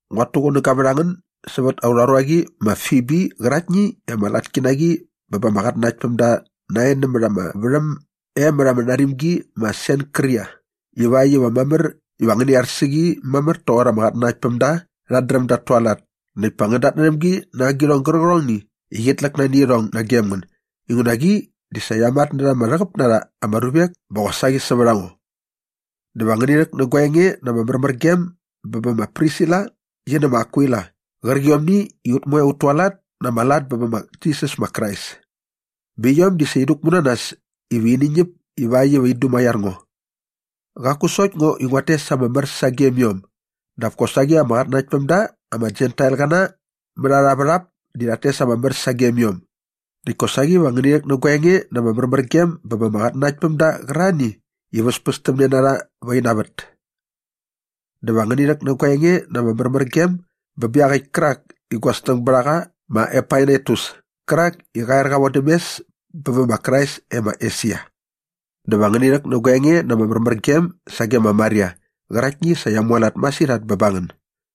Nguat tuqunäga vät a ngän sävät aurha ruaqi ma Fibi qäraktni i ama latki na qi bä ba ama qatnanaktpämda nae nämät ama värhäm e mät ama narimgi ma Senkria ivakt iva mamär iva ngäni ar sä qi mamär toqor ama qatnanaktpämda rhat dräm dat tualat näkt pa ngän datnärhäm gi na agirhong gärqärhongni i qit läk nani irhong nagem ngän inguna qi di sa qia matnärha ama rhäqäp na rha ama ruvek bä qosaqi sävät a ngo. Dä va ngäni rhäk nä gua enge na ama märmärgem bä bä ma Prisila qi nä ma Akwila qärqiomni i ut moe ut tualat na ama lat bä bä ma Jisas ma Krais. Bä iom di sa in däkmu na nas iva ini ñäp ivakt iva in dumaiar ngo. Qaku sokt ngo i nguat tes ama mär sagem iom dap kosaqi ama qatnanaktpämda ama Jentailqäna mät arha värhap di rhat tes ama mär sagem iom. Näkt kosaqi va ngäni rhäk nä gua enge na ama märmärgem bä ba ama qatnanaktpämda qärarhani i väspästämne na rha va ina vät. Dä va ngäni rhäk nä gua enge na ama märmärgem bä bä iaqäkt kärak i gua snäng bät a qa ma Epainetus kärak i qa er qa vodäm mes bä bä ma Krais e ma Esia. Dä va ngäni rhäk nä gua enge na ama märmärgem sage ma Maria qäraktni i sa qia mualat masirhat bä ba ngän.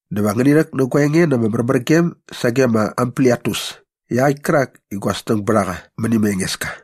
Dä va ngäni rhäk nä gua enge na ama märmärgem sage ma Ampliatus iaqäkt kärak i gua snäng bät a qa mäni ma Engeska.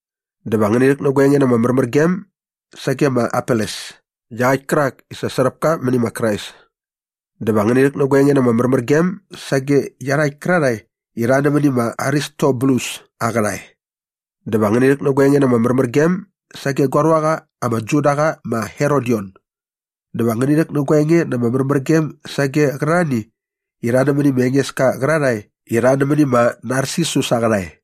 Dä va ngäni rhäk nä gua enge na ama märmärgem sage ma Apeles iaqäkt kärak i sa sräp ka mäni ma Krais. Dä va ngäni rhäk nä gua enge na ama märmärgem sage iarhakt kärarhae i rha nämäni ma Aristobulus aa qärhae. Dä va ngäni rhäk nä gua enge na ama märmärgem sage gua ruaqa ama Judaqa ma Herodion. Dä va ngäni rhäk nä gua enge na ama märmärgem sage qärarhani i rha nämäni ma Engeska qärarhae i rha nämäni ma Narsisus aa qärhae.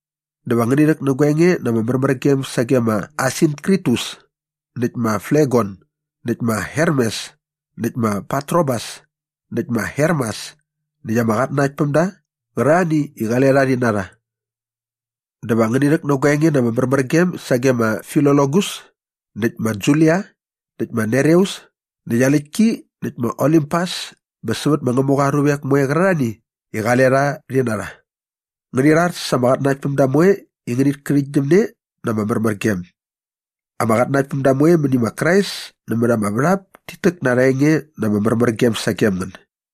Dä va ngäni rhäk nä gua enge na ama märmärgem sage ma Asinkritus näkt ma Flegon näkt ma Hermes näkt ma Patrobas näkt ma Hermas näkt ama qatnanaktpämda qärarhani i qale rha rhi na rha. Dä va ngäni rhäk nä gua enge na ama märmärgem sage ma Filologus näkt ma Julia näkt ma Nereus näkt aa läktki näkt ma Olimpas bä sävät ma Ngämuqa aa ruvek moe qärarhani i qale rha rhi na rha. Ngäni rhar sa ama qatnanaktpämda moe i ngänit kärhäktgyäm ne na ama märmärgem. Ama qatnanaktpämda moe mäni ma Krais nämät ama värhap tit täk na arha enge na ama märmärgem sagem ngän.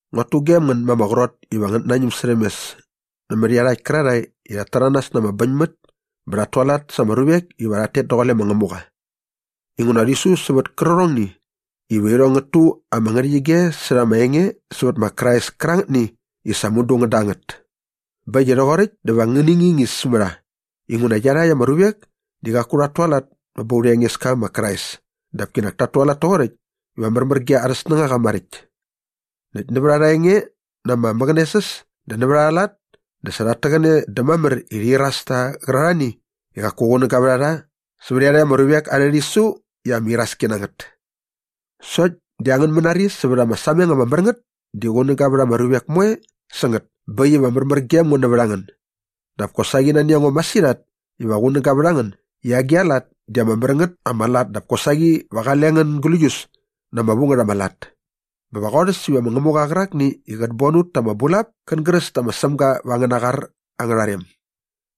Nguat tugem ngän ma ama qrot iva ngänät nañäm särhäm mes nämät iarhakt kärarhae i rhat täranas na ama bäñmät bä rhat tualat sa ama ruvek iva rhat tet daqule ma Ngämuqa. Inguna rhi su sävät kärqärhongni iva irhong ngät tu ama ngärhäqyige särha ama enge sävät ma Krais kärangätni i sa mudu ngän da ngät. Bä äkt i rhoqoräkt dä va ngäni ngingis mä rha inguna iarhakt ama ruvek di qaku rhat tualat bä ba aurha Engeska ma Krais dap kinak tat tualat toqoräkt iva märmär ge arhä snängaqa maräkt. Näkt nävät arha enge na ama mäqänesäs dä nävät arha lat dä sa rhat täqäne dä mamär i rhi iras tä qärarhani i qaku qunäga vät a rha sä iarhakt ama ruvek arhä rhisu i ama iraski na ngät. Sokt di angän mänari sävät ama sameng ama mär ngät di qunäga vät ama ruvek moe sä ngät bä äkt iva märmär gem ngo nävät a ngän. Dap kosaqi nani a ngo masirhat iva qunäga vät a ngän i agi a lat di ama mär ngät ama lat dap kosaqi va qale ngän gläius na ama vu ngät ama lat. Bä va qorhäs iva ma Ngämuqa qärakni i qät bon ut ta ama bulap kän gräs dä ma Sämga vä angäna qar angärha rem.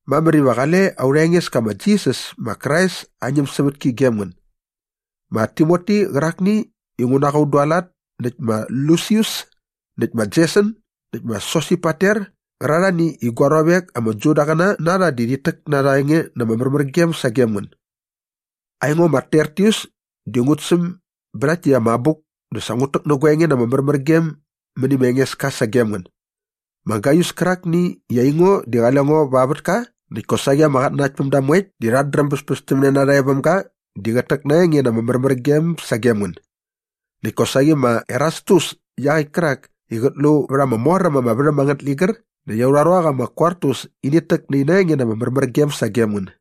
Mamär iva qale aurha Engeska ma Jisas ma Krais aa ñämsävätki gem ngän. Ma Timoti qärakni i ngu na qa un dualat näkt ma Lusius näkt ma Jeson näkt ma Sosipater qärarhani i gua ruavek ama Judaqäna na rha rhit täk na arha enge na ama märmärgem sagem ngän. Aingo ma Tertius di ngut säm bä rhakt täkt ama abuk dä sa ngut täk nä gua enge na ama märmärgem mäni ma Engeska sagem ngän. Ma Gaius kärakni i aingo di qale ngo va aa vätka näkt kosaqi ama qatnanaktpämda moekt di rhat dräm bäspästämne na rha e väm ga di qät täk na aa enge na ama märmärgem sagem ngän. Näkt kosaqi ma Erastus iaqäkt kärak i qät lu vät ama mor äm ama värhäm angät ligär näkt aurha ruaqa ma Kwartus init täk nä ina enge na ama märmärgem sagem ngän.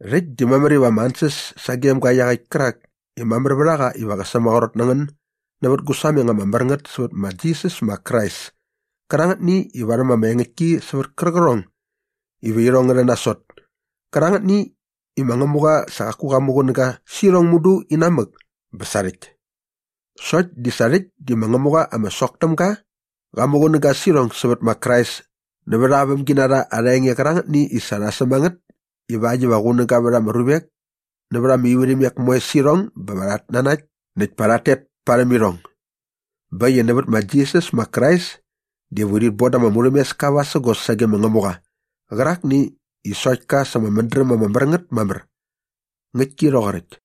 Rhäkt di mamär iva ama ansäs sagem ga iaqäkt kärak i mamär vät a qa iva qä sämaqrot na ngän nävät gu sameng ama mär ngät sävät ma Jisas ma Krais kärangätni i varhäm ama engäktki sävät kärqärhong iva irhong ngä rhän nasot kärangätni i ma Ngämuqa sa qaku qa muqunäga sä irhong mudu inamäk bä sarhäkt. Sokt di sa rhäkt di ma Ngämuqa ama sok täm ga qa muqunäga sä irhong sävät ma Krais nävät aa vämginarha arha enge qärangätni i sa rha säm a ngät ivakt iva qunäga vät ama ruvek nävät ama ivärhimek moe sä irhong bä va rhat nanakt näkt pa rhat tet parhäm irhong. Bä äkt i nävät ma Jisas ma Krais diva urhit bon da ama murhämeska vasägos sage ma Ngämuqa qärakni i sokt ka sa ama mädräm ama mär ngät mamär. Ngäktki rhoqoräkt.